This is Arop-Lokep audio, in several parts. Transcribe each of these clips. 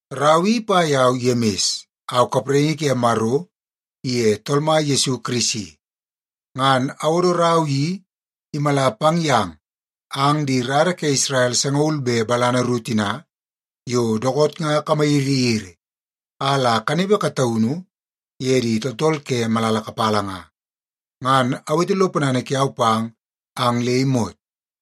Rau i ipa yau Yemis. Au kapraingi ke Maro iye Tool Mai Yesu Kirisi. Ngan awodo rau i imala pang yang ang di rara ke Isrel sangaul be balana ru tina yo dookoot nga kamayiriyiri a la kanepe kataunu ye di tooltool ke malala kapala nga. Ngan awete lo ponana kiau pang ang le imot.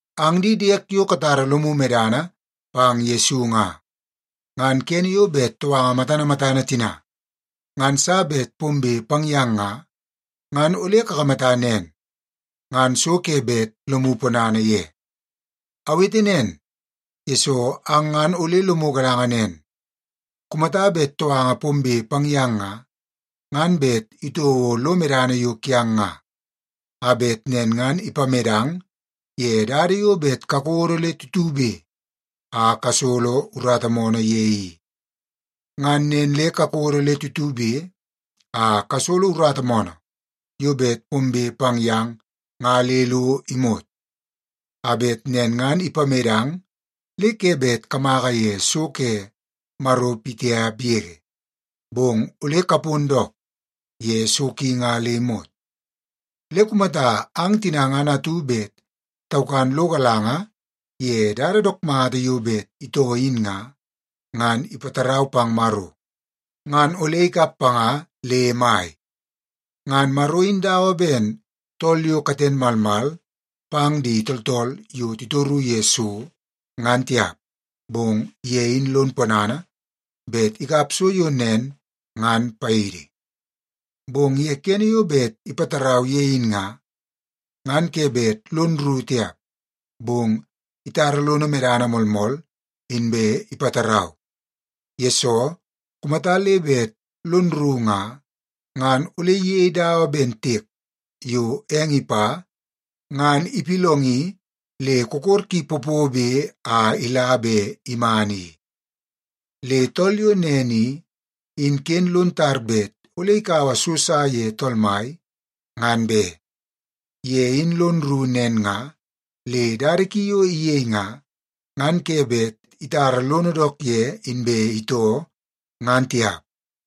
Ang di diek yo katara lomu medana pang Yesu nga, ngan kene yo bet touanga matana matana tina ngan sa bet pombe pang yang nga, ngan ole kakamata nen, ngan so ke bet lomu ponana ye. Awete nen, yesoo ang ngan ole lomu galanga nen, kumata bet touanga pombe pang yang nga, ngan bet itouo lo medana yo kiang nga, a bet nen ngan ipamedang ye dada yo bet kakodo le tutube a kasolo urata moonoo ye i. Ngan nen le kakodo le tutube a kasolo urata moonoo yo bet pombe pang yang nga le lo imot, a bet nen ngan ipamedang le ke bet kamaka ye so ke Maro pitiap yege, bong ole kapon dook ye so ki nga le imot. Le kumata ang tina ngan atu bet taukan lo galanga ye dada dook mata yo bet itoo in nga, ngan ipatarau pang Maro ngan ole ikap panga le mai. Ngan Maro in dawa ben tool yo katen malmal pang di tooltool yo titoru ye so, ngan tiap, bong ye in lon ponana bet ikap so yo nen ngan paidi. Bong ye kene yo bet ipatarau ye in nga, ngan ke bet lon rru tiap, bong itara lono medana moolmool inbe ipatarau. Yesoo, kumata le bet lon rru nga, ngan ole iyei dawa ben tiek yo eng ipa ngan ipillongi le kokor ki popobe a ila be iman i. Le tool yo nen i, in ken lon tar bet ole ikaua so sa ye Tool Mai, ngan be. Ye in lon rru nen nga le dada ki yo iyei nga, ngan ke bet itara lono dook ye inbe itoo, ngan tiap.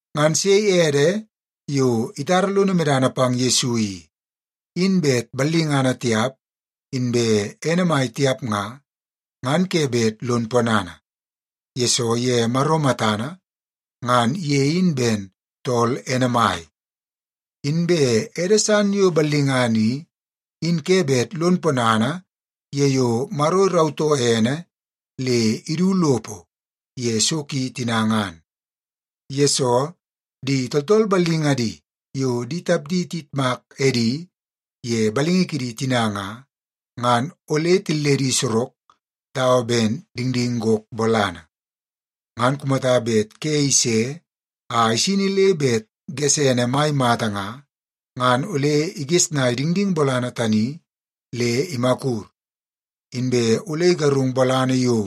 Ngan sei ede yo itara lono medana pang Yesu i, in bet ballingana tiap inbe ene mai tiap nga, ngan ke bet lon ponana, yesoo ye Maro matana ngan ye in ben tool ene mai. Inbe ede san yo ballingana i, in ke bet lon ponana ye yo Maro irautoo ene le idu lopo ye so ki tina ngan. Yesoo, di tooltool ballingadi yo di tapdi tiyitmak edi ye balingi kidi tina nga, ngan ole tilledi sorok dawa ben dingding gok bolana. Ngan kumata bet ke ise a isini le bet gesene mai mata nga, ngan ole igesnaia dingding bolana tani le imakur, inbe ole igarung bolana yo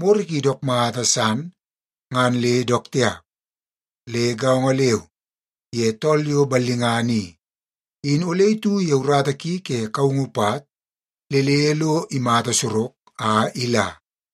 moro ki dook mata san ngan le dook tiap. Le gaongo leu ye tool yo ballingana i, in ole itu ye urata ki ke kaungu pat le le lo imata sorok a ila.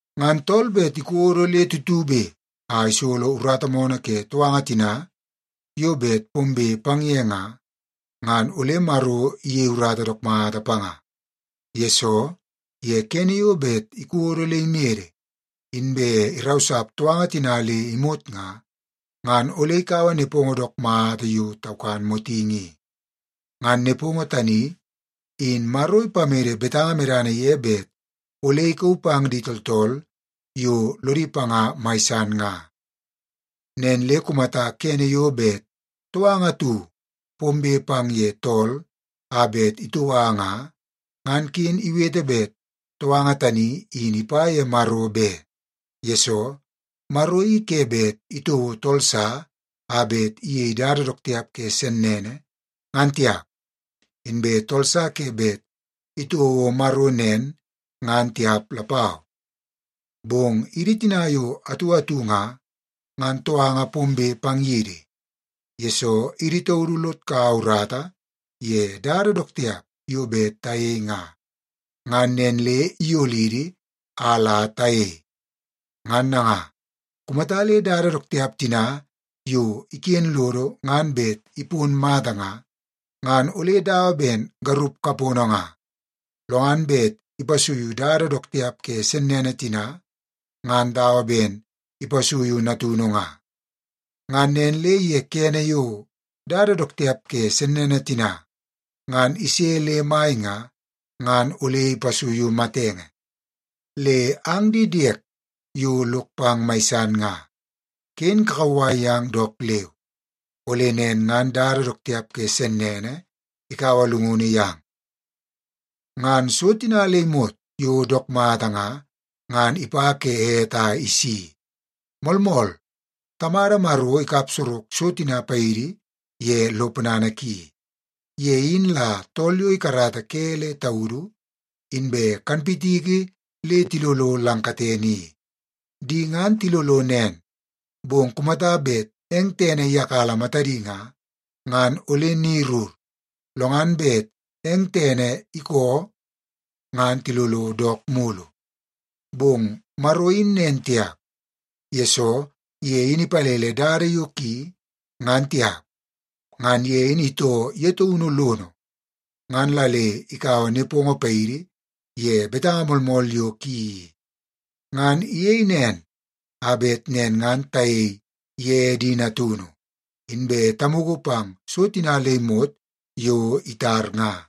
Ngan tool bet ikodo le tutube a isolo urata moonoo ke touanga tina yo bet pombe pang ye nga, ngan ole Maro iyei urata dook mata panga. Yesoo, ye kene yo bet ikodo le imede inbe irausap touanga tina le imot nga, ngan ole ikaua nepongo dook mata yo taukan motingi i. Ngan nepongo tani in Maro ipamede betanga medana ye bet ole ikauu pang di tooltool yo lodi panga mai san nga. Nen le kumata kene yo bet touanga atu pombe pang ye tool a bet itoua nga, ngan ken iwete bet touanga tani in ipa ye Maro be. Yesoo, Maro i ke bet itouo tool sa a bet iyei dada dook tiap ke sennene ngan tiap, inbe tool sa ke bet itouo Maro nen ngan tiap lapau. Bong idi tina yo atu atu nga, ngan touanga pombe pang yidi, yesoo idi taudu lod kaua urata ye dada dook tiap yo bet tayei nga, ngan nen le iyolidi a la tayei. Ngan nanga, kumata le dada dook tiap tina yo iken lodo ngan bet ipon mata nga, ngan ole dawa ben garup kapono nga, lo ngan bet ipasuiu dada dook tiap ke sennene tina ngan dawa ben ipasuiu natunu nga. Ngan nen le ye kene yo dada dook tiap ke sennene tina ngan ise le mai nga, ngan ole ipasuiu matenge. Le ang di diek yo lok pang mai san nga, ken kakauwai yang dook leu, ole nen ngan dada dook tiap ke sennene ikaua llungunu yang. Ngan so tina le imot yo dook mata nga, ngan ipa ke ete a isi. Moolmool, Tamada Maro ikap sorok so tina paidi ye lo ponana ki. Ye in la tool yo ikarata ke le taudu inbe kanpitiki le tilolo lang katene i. Di ngan tilolo nen, bong kumata bet eng tene iyakala matadi nga, ngan ole ni rur, lo ngan bet eng tene ikoo ngan tilolo dook mulu. Bong Maro in nen tiap, yesoo ye in ipalele dada yo ki ngan tiap. Ngan ye in itoo ye taunu lono, ngan la le ikaua nepongo paidi ye betanga moolmool yo ki i. Ngan iyei nen a bet nen ngan tayei ye di natunu, inbe tamugu pang so tina le imot yo itar nga.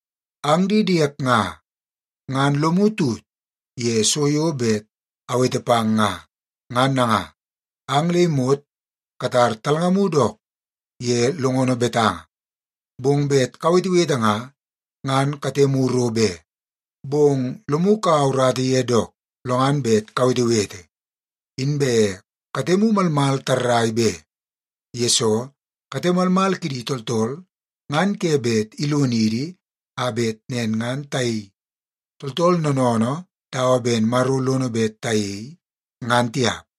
Ang di diek nga, ngan lomu tut ye so yo bet awete pang nga. Ngan nanga, ang le imot katar talngamu dook ye longono betanga, bong bet kawetewete nga, ngan katemu ro be, bong lomu kaua urata ye dook lo ngan bet kawetewete. Inbe katemu malmal tarrai be, yesoo kate malmal kidi tooltool ngan ke bet ilonidi a bet nen ngan tayei tooltool noonoonoo dawa ben Maro lono bet tayei, ngan tiap.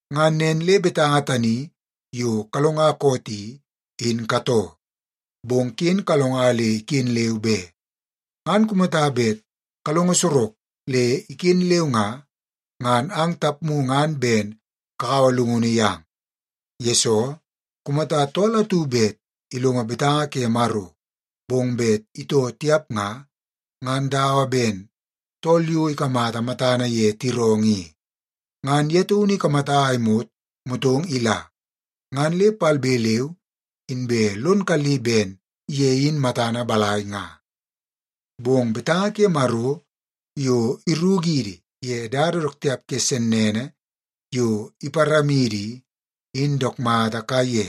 Ngan nen le betanga tani yo kalonga koot i, in katoo. Bong ken kalonga le iken leu be. Ngan kumata bet kalonga sorok le iken leu nga, ngan ang tapmu ngan ben kakaua llungunu yang. Yesoo, kumata tool atu bet ilongo betanga ke Maro, bong bet itoo tiap nga, ngan dawa ben tool yo ikamata matana ye tiroongoo i. Ngan ye taunu ikamata a imot motong ila, ngan le palbe leu inbe lon kalli ben ye in matana balai nga. Bong betanga ke Maro yo irukidi ye dada dook tiap ke sennene yo iparamidi i, in dook mata kaiye.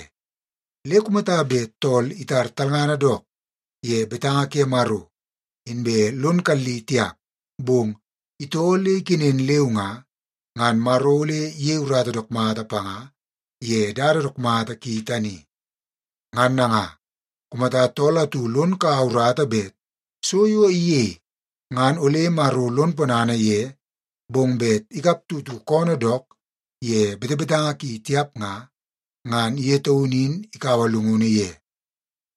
Le kumata bet tool itar talngana dook ye betanga ke Maro inbe lon kalli tiap, bong itoo le ikenen leu nga, ngan Maro ole iyei urata dook mata panga ye dada dook mata ki tani. Ngan nanga, kumata tool atu lon kaua urata bet so yo iyei ngan ole Maro lon ponana ye, bong bet ikap tutu koonoo dook ye betebetanga ki tiap nga, ngan ye taunu in ikaua llungunu ye.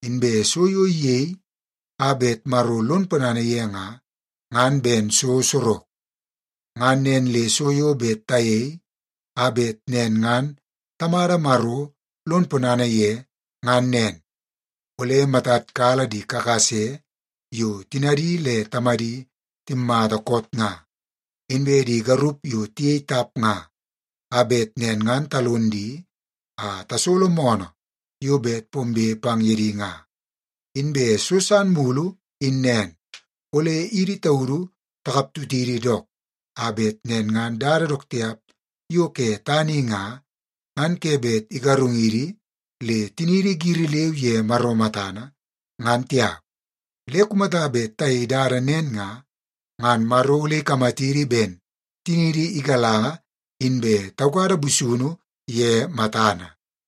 Inbe so yo iyei a bet Maro lon ponana ye nga, ngan ben so sorok. Ngan nen le so yo bet tayei a bet nen ngan Tamada Maro lon ponana ye ngan nen. Ole matad kala di kakase yo tinadi le tamadi timmata koot nga, inbe di garup yo tiyei tap nga, a bet nen ngan talon di a tasolo moonoo yo bet pombe pang ye di nga. Inbe so san mulu in nen, ole idi taudu takap tutidi dook, a bet nen ngan dada dook tiap yo ke tana i nga, ngan ke bet igarungidi le tiniidi giri leu ye Maro matana, ngan tiap. Le kumata bet tayei dada nen nga, ngan Maro ole ikamatidi ben tiniidi igalanga inbe taukada busunu ye matana.